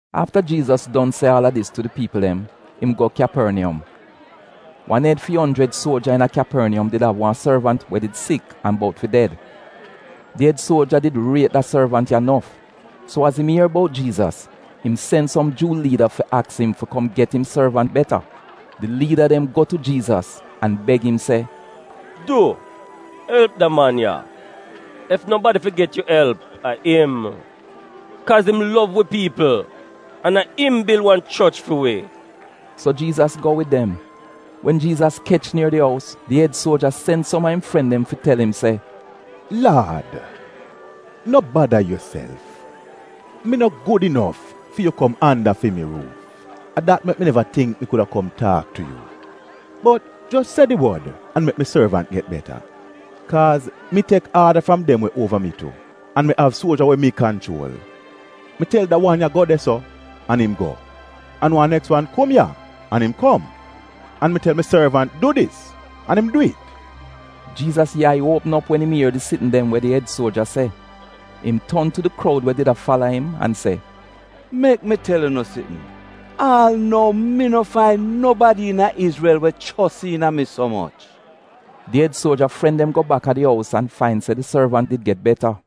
Afta Jiizas don se aal a dis tu di piipl dem, im go Kyaporniyom. Wan ed fi onjrid suoja iina Kyaporniyom did av wan sorvant we did sik an bout fi ded. Di ed suoja did riet da sorvant ya nof, so az im ier bout Jiizas, im sen som Juu liida fi aks im fi kom get im sorvant beta. Di liida dem go tu Jiizas an beg im se, “Du elp da man ya, ef nobadi fi get yu elp, a im. Kaaz im lov wi piipl an a im bil wan choch fi wi.” So Jiizas go wid dem. Wen Jiizas kech nier di ous, di ed suoja sen som a im fren dem fi tel im se, “Laad, no bada yuself, mi no gud inof fi yu kom anda fi mi ruuf. A dat mek mi neva tingk mi kuda kom taak tu yu. Bot jos se di wod an mek mi sorvant get beta. Kaaz mi tek aada fram dem we uova mi tu, an mi av suoja we mi kanchuol. Mi tel da wan ya, ‘Go de-so,’ an im go, an wan neks wan ‘Kom ya,’ an im kom. An mi tel mi sorvant, ‘Du dis,’ an im dwi'it.” Jiizas yai uopm op wen im ier di sitn dem we di ed suoja se. Im ton tu di kroud we did a fala im an se, “Mek mi tel unu sitn, aal nou mi no fain nobadi iina Izrel we chos iina mi so moch!” Di ed suoja fren dem go baka di ous an fain se di sorvant did get beta.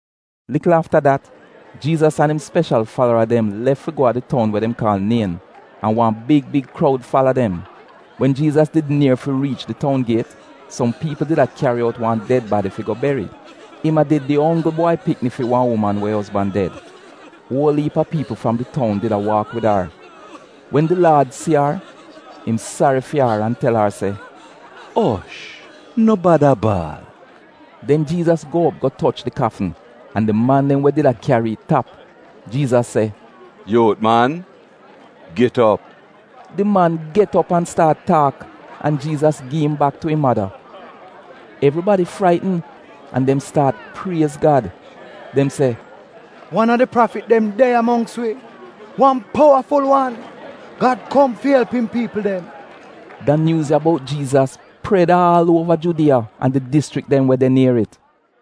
Likl afta dat, Jiizas an im speshal falara dem lef fi go a di toun we dem kaal Nien, an wan big big kroud fala dem. Wen Jiizas did nier fi riich di toun giet, som piipl did a kyari out wan ded badi fi go beri. Im a did di onggl bwai pikni fi wan uman we ozban ded. Uol iip a piipl fram di toun did a waak wid ar. Wen di Laad si ar, im sari fi ar an tel ar se, “Osh! No bada baal!” Den Jiizas go op go toch di kafn, an di man dem we did a kyari it tap. Jiizas se, “Yuut man, git op!” Di man get op an staat taak an Jiizas gi im bak tu im mada. Evribadi fraitn, an dem staat priez Gad. Dem se, “Wan a di prafit dem de ya mongks wi, wan powaful wan! Gad kom fi elp im piipl dem.” Da nyuuz ya bout Jiizas pred aal uova Judiya an di dischrik dem we de nier it.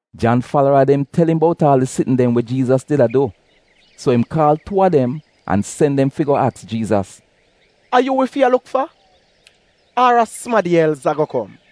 Jan falara dem tel im bout aal di sitn dem we Jiizas did a du, so im kaal tuu a dem an sen dem fi go aks Jiizas, “A yu wi fi a luk fa, ar a sumadi els ago kom?”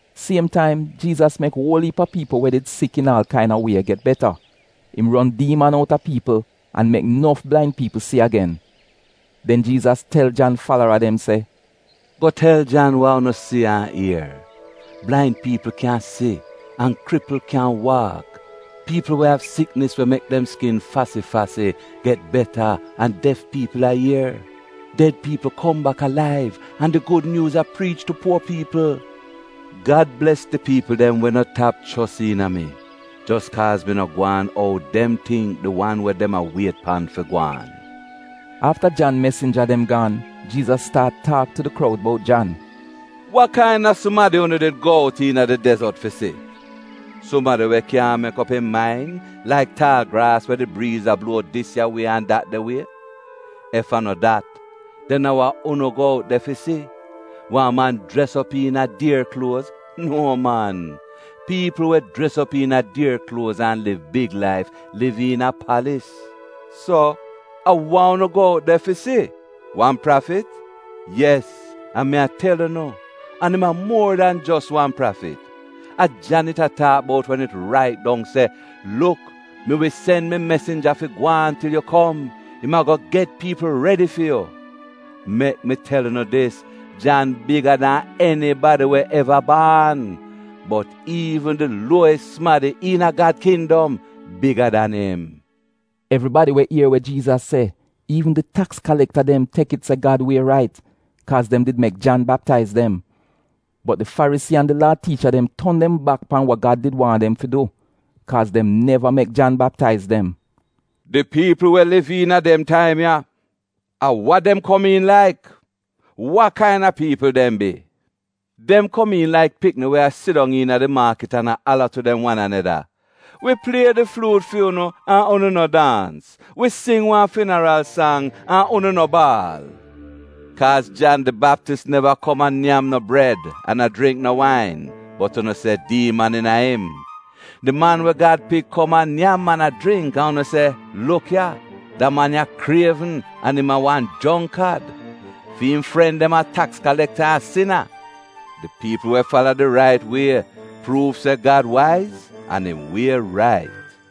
Siem taim Jiizas mek uol iip a piipl we did sik iina aal kaina wie get beta, im ron diiman outa piipl, an mek nof blain piipl si agen. Den Jiizas tel Jan falara dem se, “Go tel Jan wa unu si an ier. Blain piipl kyan si an kripl kyan waak. Piipl we av siknis we mek dem skin fasi-fasi get beta an def piipl a ier. Ded piipl kom bak alaiv an di gud nyuuz a priich tu puo piipl. Gad bles di piipl dem we no tap chos iina mi jos kaaz mi no gwaan ou dem tingk di wan we dem a wiet pan fi gwaan.” Afta Jan mesinja dem gaan, Jiizas staat taak tu di kroud bout Jan, “Wa kaina sumadi unu did go out iina di dezot fi si? Sumadi we kyaahn mek op im main laik taal graas we di briiz a bluo dis ya wie an dat de wie? Ef a no dat, den a wa unu go out de fi si? Wan man jres op iina a dier kluoz? Nuo man, piipl we jres op iina dier kluoz an liv big laif, liv iina palis. So a wa unu go out de fi si? Wan prafit? Yes, an mi a tel unu, an im a muor dan jos wan prafit. A Jan it a taak bout wen it rait dong se: “ ‘Luk, mi wi sen mi mesinja fi gwaan til yu kom, im ago get piipl redi fi yu.’ Mek mi tel unu dis, Jan biga dan enibadi we eva baan. Bot iivn di luowis sumadi iina Gad kindom, biga dan im.” (Evribadi we ier we Jiizas se, iivn di taks kalekta dem, tek it se Gad wie rait, kaaz dem did mek Jan baptaiz dem. Bot di Farisii an di Laa tiicha dem ton dem bak pan wa Gad did waahn dem fi du, kaaz dem neva mek Jan Baptaiz dem.) “Di piipl we a liv iina dem taim ya, a we dem komiin laik? Wa kaina piipl dem bi? Dem komiin laik pikni we a sidong iina di maakit an a ala tu dem wan aneda: “ ‘Wi plie di fluut fu'unu, an unu no daans: wi sing wan finaral sang, an unu no baal.’ Kaaz Jan di Baptis neva kom a nyam no bred an a jringk no wain, bot unu se, ‘Diiman iina im.’ Di Man we Gad Pik kom a nyam an a jringk, an unu se, ‘Luk ya, da man ya krievn an im a wan jongkad. Fi'im fren dem a taks kalekta an sina.’ Di piipl we fala di rait wie pruuv se Gad waiz an im wie rait.”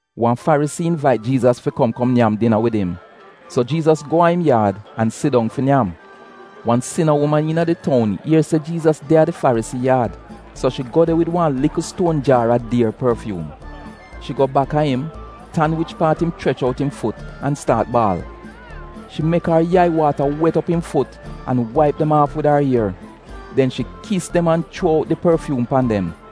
Wan Farisii invait Jiizas fi kom kom nyam dina wid im, so Jiizas go a im yaad an sidong fi nyam. Wan sina uman iina di toun ier se Jiizas de a di Farisii yaad, so shi go de wid wan likl stuon jaar a dier porfyuum. Shi go baka im, tan wich paat im chrech out im fut an staat baal. Shi mek ar yai waata wet op im fut an waip dem aaf wid ar ier, den shi kis dem an chuo out di porfyuum pan dem.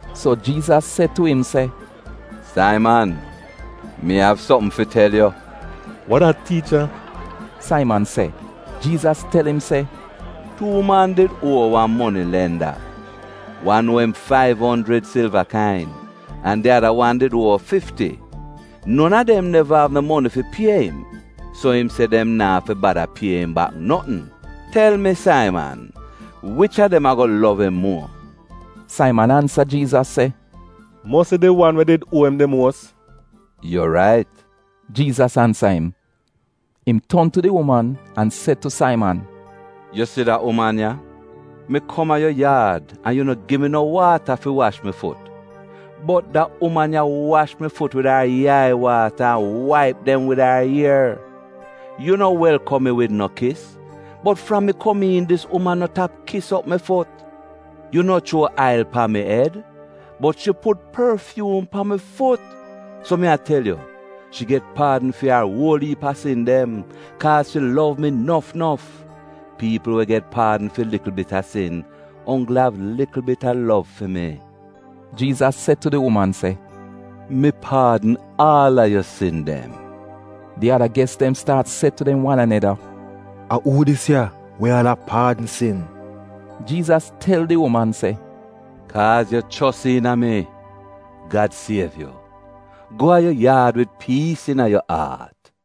So Jiizas se tu im se, “Saiman, Mi av sopm fi tel yu.” “Wa dat, tiicha?” Saiman se. Jiizas tel im se, “Tuu man did uo wan monilenda. Wan uo im faiv onjrid silva kain, an di ada wan did uo fifti. Non a dem neva av no moni fi pie im, so im se dem naa fi bada pie im bak notn. Tel mi Saiman, wich a dem ago lov im muo?” Saiman ansa Jiizas se, “Mosi di wan we did uo im di muos.” “Yu rait,” Jiizas ansa im. Im ton tu di uman an se tu Saiman, “Yu si da uman ya? Mi kom a yu yaad an yu no gi mi no waata fi wash mi fut. Bot da uman ya wash mi fut wid ar yai-waata an waip dem wid ar ier. Yu no welkom mi wid no kis, bot fram mi kom iin dis uman, no tap kis op mi fut. Yu no chuo ail pan mi ed, bot shi put porfyuum pan mi fut. So mi a tel yu, shi get paadn fi ar uol iip a sin dem, kaaz shi lov mi nof nof. Piipl we get paadn fi likl bit a sin, onggl av likl bit a lov fi mi.” Jiizas se tu di uman se, “Mi paadn aal a yu sin dem.” Di ada ges dem staat se tu dem wan aneda, “A uu dis ya we aal a paadn sin?” Jiizas tel di uman se, “Kaaz yu chos iina mi, Gad siev yu. Go a yu yaad wid piis iina yu aat.”